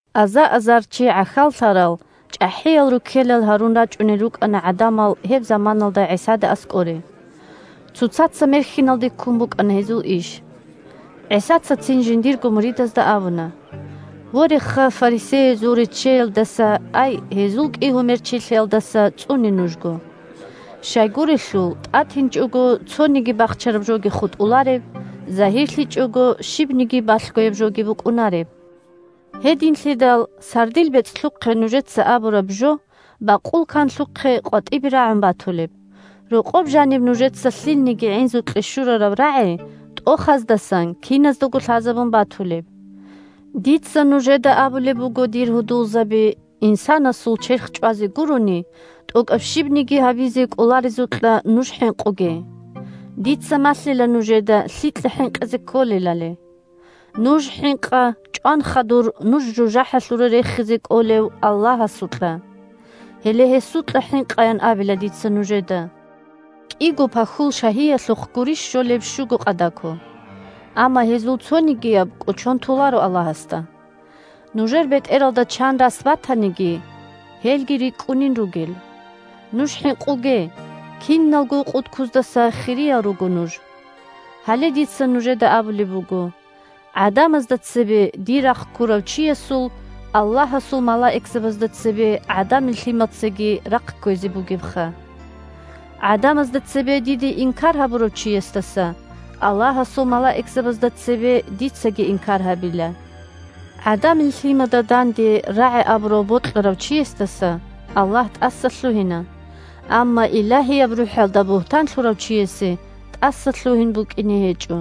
Аза-азар чи гӀахьаллъарал чӀахӀиял руккелал гьарун рачӀунел рукӀана гӀадамал гьеб заманалда ГӀисада аскӀоре. Цоцаца мерхьиналде ккун букӀана гьезул иш. ГӀисаца цин жиндирго муридазда абуна: – Вореха, фарисеязул реччеялдаса, ай гьезул кӀигьумерчилъиялдаса цӀуне нужго. Щайгурелъул тӀатинчӀого цониги бахчараб жоги хутӀулареб, загьирлъичӀого щибниги балъгояб жоги букӀунареб. Гьединлъидал сардил бецӀлъухъе нужеца абураб жо, бакъул канлъухъе къватӀибе рагӀун батулеб; рокъоб жаниб нужеца лъилниги гӀинзукье щурараб рагӀи, тӀохаздасан киназдаго лъазабун батулеб. Дица нужеда абулеб буго, дир гьудулзаби: инсанасул черх чӀвазе гурони, тӀокӀаб щибниги гьабизе кӀоларезукьа нуж хӀинкъуге. Дица малъила нужеда лъикьа хӀинкъизе кколелали. Нуж хӀинкъа чӀван хадур нуж жужахӀалъуре рехизе кӀолев Аллагьасукьа. Гьеле гьесукьа хӀинкъаян абила дица нужеда. КӀиго пахьул шагьиялъухъ гурищ щолеб щуго къадако? Амма гьезул цонигияб кӀочон толаро Аллагьасда. Нужер бетӀералда чан рас батаниги, гьелги рикӀкӀунин ругел. Нуж хӀинкъуге, киналго къудкуздаса хириял руго нуж. Гьале дица нужеда абулеб буго: гӀадамазда цебе дир рахъ ккурав чиясул, Аллагьасул малаикзабазда цебе, ГӀадамил Лъимацаги рахъ кквезе бугебха. ГӀадамазда цебе диде инкар гьабурав чиясдаса, Аллагьасул малаикзабазда цебе, дицаги инкар гьабила. ГӀадамил Лъимада данде рагӀи абурав бокьарав чиясдаса Аллагь тӀасалъугьина, амма Илагьияб РухӀалда бугьтан лъурав чиясе тӀасалъугьин букӀине гьечӀо.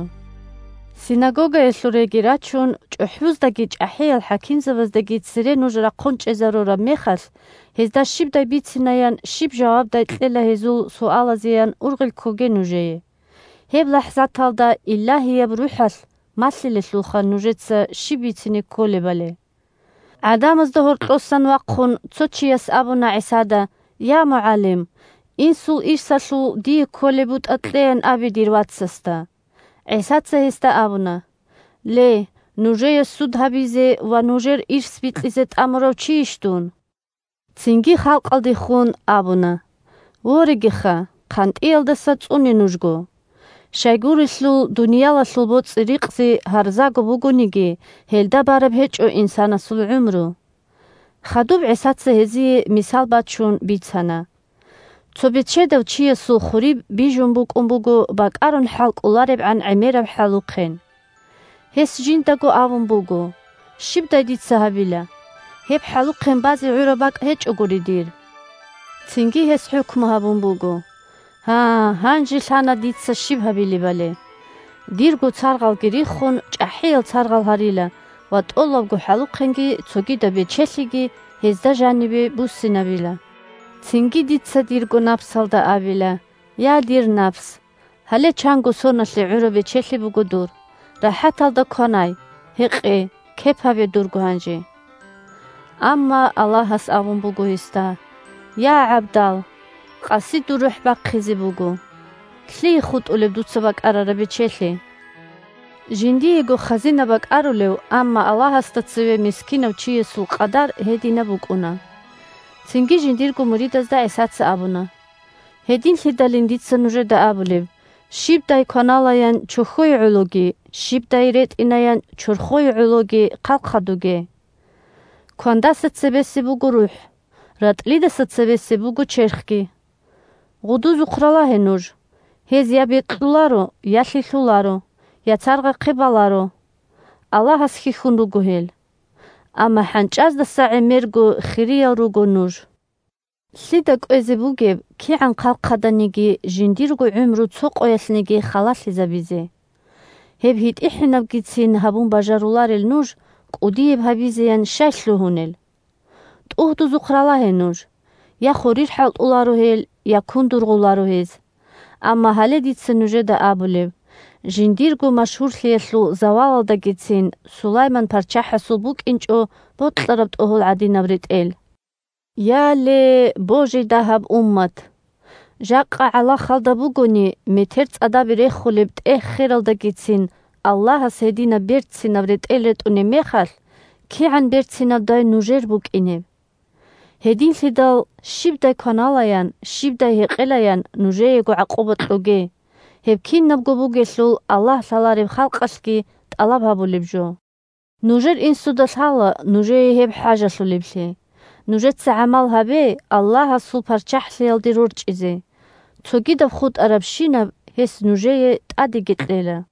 Синагогаялъуреги рачун, чӀухӀбуздаги чӀахӀиял хӀакимзабаздаги цере нуж рахъун чӀезарураб мехалъ, гьезда щибдай бицинаян, щиб жавабдай кьела гьезул суалазеян ургъел ккоге нужее; гьеб лахӀзаталда Илагьияб РухӀалъ малъилелъулха нужеца щиб бицине кколебали. ГӀадамазда гьоркьосан вахъун, цо чияс абуна ГӀисада: – Я, МугӀалим! Инсул ирсалъул дие кколеб бутӀа кьеян абе дир вацасда. ГӀисаца гьесда абуна: – Ле, нужее суд гьабизе ва нужер ирс бикьизе тӀамурав чийищ дун? Цинги халкъалдехун абуна: – Ворегиха, хъантӀиялдаса цӀуне нужго! Щайгурелъул дуниялалъул боцӀи-рикъзи гьарзаго бугониги, гьелда бараб гьечӀо инсанасул гӀумру. Хадуб ГӀисаца гьезие, мисал бачун, бицана: – Цо бечедав чиясул хуриб бижун букӀун буго бакӀарун хӀалкӀоларебгӀан гӀемераб хӀалухъен. Гьес жиндаго абун буго: «Щибдай дица гьабила. Гьеб хӀалухъен базе гӀураб бакӀ гьечӀогури дир». Цинги гьес хӀукму гьабун буго: «Гьа, гьанже лъана дица щиб гьабилебали. Дирго царгъалги риххун, чӀахӀиял царгъал гьарила ва тӀолабго хӀалухъенги цогидаб бечелъиги гьезда жанибе буссинабила. Цинги дица дирго напсалда абила: „Я, дир напс! Гьале чанго соналъе гӀураб бечелъи буго дур. РахӀаталда кванай, гьекъе, кеп гьабе дурго гьанже!“» Амма Аллагьас абун буго гьесда: «Я, гӀабдал! Къаси дур рухӀ бахъизе буго! Лъие хутӀулеб дуца бакӀарараб бечелъи?» Жиндиего хазина бакӀарулев, амма Аллагьасда цеве мискинав чиясул къадар гьединаб букӀуна. Цинги жиндирго муридазда ГӀисаца абуна: – Гьединлъидалин дица нужеда абулеб: щибдай кваналаян чохьое гӀологи, щибдай ретӀинаян чорхое гӀологи хъалхъадуге. Квандаса цебесеб буго рухӀ, ратӀлидаса цебесеб буго черхги. Гъудузухъ ралагье нуж: гьез я бекьуларо, я лъилъуларо, я царгъахъе баларо. Аллагьас хьихьун руго гьел. Амма хӀанчӀаздаса гӀемерго хириял руго нуж. Лъида кӀвезе бугеб, кигӀан хъалхъаданиги, жиндирго гӀумру цо къоялъниги халалъизабизе. Гьеб гьитӀихӀинабгицин гьабун бажаруларел нуж кӀудияб гьабизеян щай лъугьунел? ТӀугьдузухъ ралагье нуж. Я хурир хӀалтӀуларо гьел, я кун дургъуларо гьез. Амма гьале дица нужеда абулеб: жиндирго машгьурлъиялъул завалалдагицин Сулайман парччахӀасул букӀинчӀо бокьараб тӀогьол гӀадинаб ретӀел. Я, ле – божи дагьаб уммат! Жакъа гӀалахалда бугони, метер цӀадабе рехулеб тӀегь-хералдагицин Аллагьас гьединаб берцинаб ретӀел ретӀунеб мехалъ, кигӀан берцинабдай нужер букӀинеб! Гьединлъидал щибдай кваналаян, щибдай гьекъелаян нужеего гӀакъуба кьоге, гьеб кинабго бугелъул Аллагь лъалареб халкъалъги тӀалаб гьабулеб жо. Нужер Инсуда лъала нужее гьеб хӀажалъулеблъи. Нужеца гӀамал гьабе Аллагьасул ПарччахӀлъиялде рорчӀизе, цогидаб хутӀарабщинаб гьес нужее тӀадеги кьела.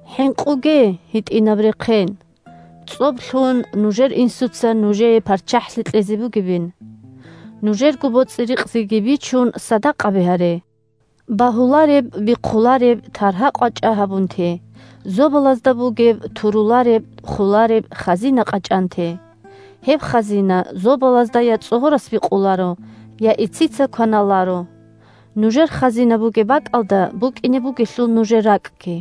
ХӀинкъуге, гьитӀинаб рехъен! ЦӀоб лъун, нужер Инсуца нужее ПарччахӀлъи кьезе бугебин. Нужерго боцӀи-рикъзиги бичун садакъаби гьаре. Багьулареб-бихъулареб таргьа-къвачӀа гьабун те, зобалазда бугеб турулареб-холареб хазина къачӀан те. Гьеб хазина зобалазда я цӀогьорас бикъуларо, я ицица кваналаро. Нужер хазина бугеб бакӀалда букӀине бугелъул нужер ракӀги.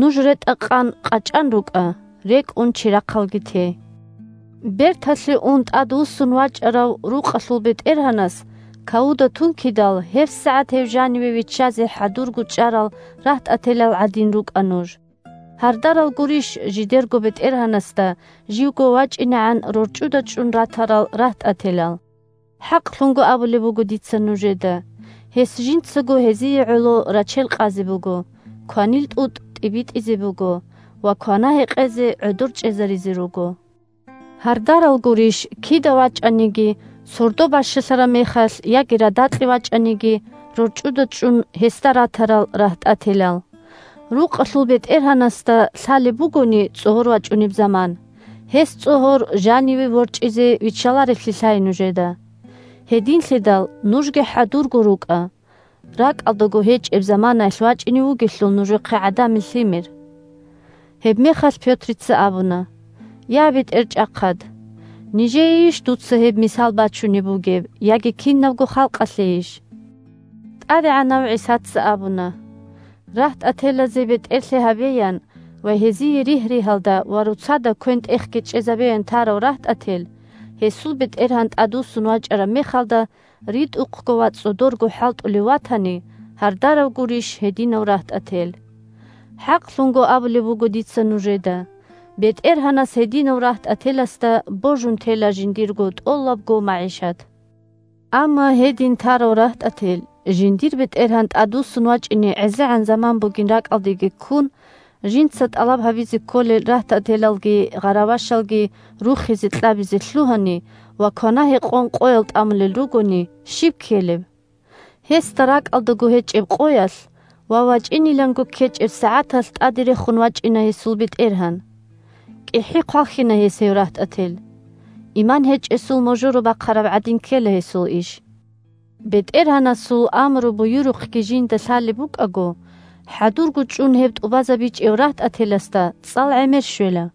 Нуж ретӀа-къан къачӀан рукӀа, рекӀун чирахъалги те. Берталъе ун тӀадвуссун вачӀарав рукъалъул бетӀергьанас кавуда тункидал, гьебсагӀат гьев жаниве виччазе хӀадурго чӀарал рагьтӀателал гӀадин рукӀа нуж. Гьардарал гурищ, жидерго бетӀергьанасда живго вачӀинегӀан рорчӀуда чӀун ратарал рагьтӀателал. ХӀакълъун абулеб буго дица нужеда, гьес жинцаго гьезие гӀоло рачел къазе буго, кванил тӀутӀ тӀибитӀизе буго ва квана-гьекъезе гӀодор чӀезаризе руго. Гьардарал гурищ, кида вачӀаниги: сордо бащалъараб мехалъ, яги радакье вачӀаниги, рорчӀуда чӀун гьесда ратарал рагьтӀателал. Рукъалъул бетӀергьанасда лъалеб бугони цӀогьор вачӀунеб заман, гьес цӀогьор жаниве ворчӀизе виччаларевлъи лъай нужеда. Гьединлъидал нужги хӀадурго рукӀа, ракӀалдаго гьечӀеб заманаялъ вачӀине вугелъул нужехъе ГӀадамил Лъимер. Гьебмехалъ Пётрица абуна: – Я, БетӀерчӀахъад! Нижеейищ дуца гьеб мисал бачунеб бугеб, яги кинабго халкъалъейищ? ТӀадегӀанав ГӀисаца абуна: – РагьтӀателазе бетӀерлъи гьабеян ва гьезие ригь-ригьалда ва роцада квен-тӀехги чӀезабеян тарав рагьтӀател, гьесул бетӀергьан тӀадвуссун вачӀараб мехалда ритӀухъго ва цӀодорго хӀалтӀулев ватани, – гьардарав гурищ гьединав рагьтӀател. ХӀакълъун абулеб буго дица нужеда: бетӀергьанас гьединав рагьтӀателасда божун тела жиндир тӀолабго магӀишат. Амма гьедин тарав рагьтӀател, жиндир бетӀергьан тӀадвуссун вачӀине гӀезегӀан заман бугин ракӀалдеги ккун, жинца тӀалаб гьабизе кколел рагьтӀателалги гъаравашалги рухизе-кьабизе лъугьани ва квана-гьекъон къоял тӀамулел ругони, щиб ккелеб? Гьесда ракӀалдаго гьечӀеб къоялъ ва вачӀиниланго ккечӀеб сагӀаталъ тӀаде рехун вачӀина гьесул бетӀергьан. КӀихӀи хъвалхьина гьес гьев рагьтӀател, – иман гьечӀесул можоро бахъараб гӀадин ккела гьесул иш. БетӀергьанасул амру-буюрухъги жинда лъалеб букӀаго, хӀадурго чӀун гьеб тӀубазабичӀев рагьтӀателасда цӀал гӀемер щвела.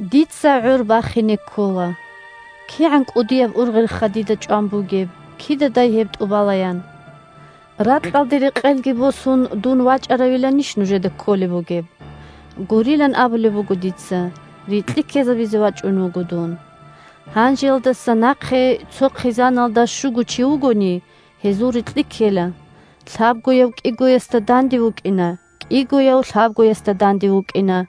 Дица гӀор бахине ккола. КигӀан кӀудияб ургъелха дида чӀван бугеб, кидадай гьеб тӀубалаян. Ракьалде рекъелги босун дун вачӀаравиланищ нужеда кколеб бугеб? Гурилан абулеб буго дица, рикьи ккезабизе вачӀун вуго дун. Гьанжеялдаса нахъе, цо хъизаналда щуго чи вугони, гьезул рикьи кьела: лъабгояв кӀигоясда данде вукӀина, кӀигояв лъабгоясда данде вукӀина.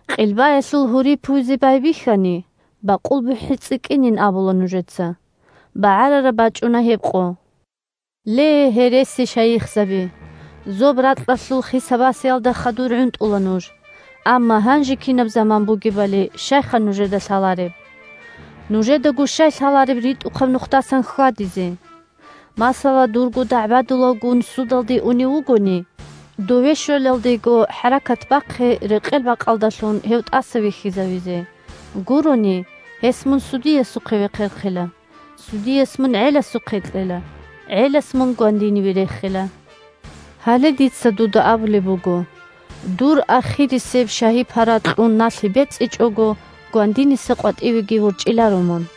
Къилбаялъул гьури пуйзе байбихьани, бакъул бухӀи цӀикӀкӀинин абула нужеца. БагӀарараб бачӀуна гьеб къо. Ле, гьересишайихзаби, зоб-ракьалъул хиса-басиялда хадур гӀунтӀула нуж, амма гьанже кинаб заман бугебали щайха нужеда лъалареб? Нужедаго щай лъалареб ритӀухъаб нухдасан хьвадизе? Масала, дурго дагӀбадулавгун судалде унев вугони, дове щвелалдего хӀаракат бахъе рекъел-бакъалдалъун гьев тӀаса вихьизавизе. Гурони, гьес мун судиясухъе вехъерхъила, судияс мун гӀеласухъе кьела, гӀелас мун гвандиниве рехила. Гьале дица дуда абулеб буго: дур ахирисеб шагьи-пара кьун налъи бецӀичӀого, гвандиниса къватӀивеги ворчӀиларо мун.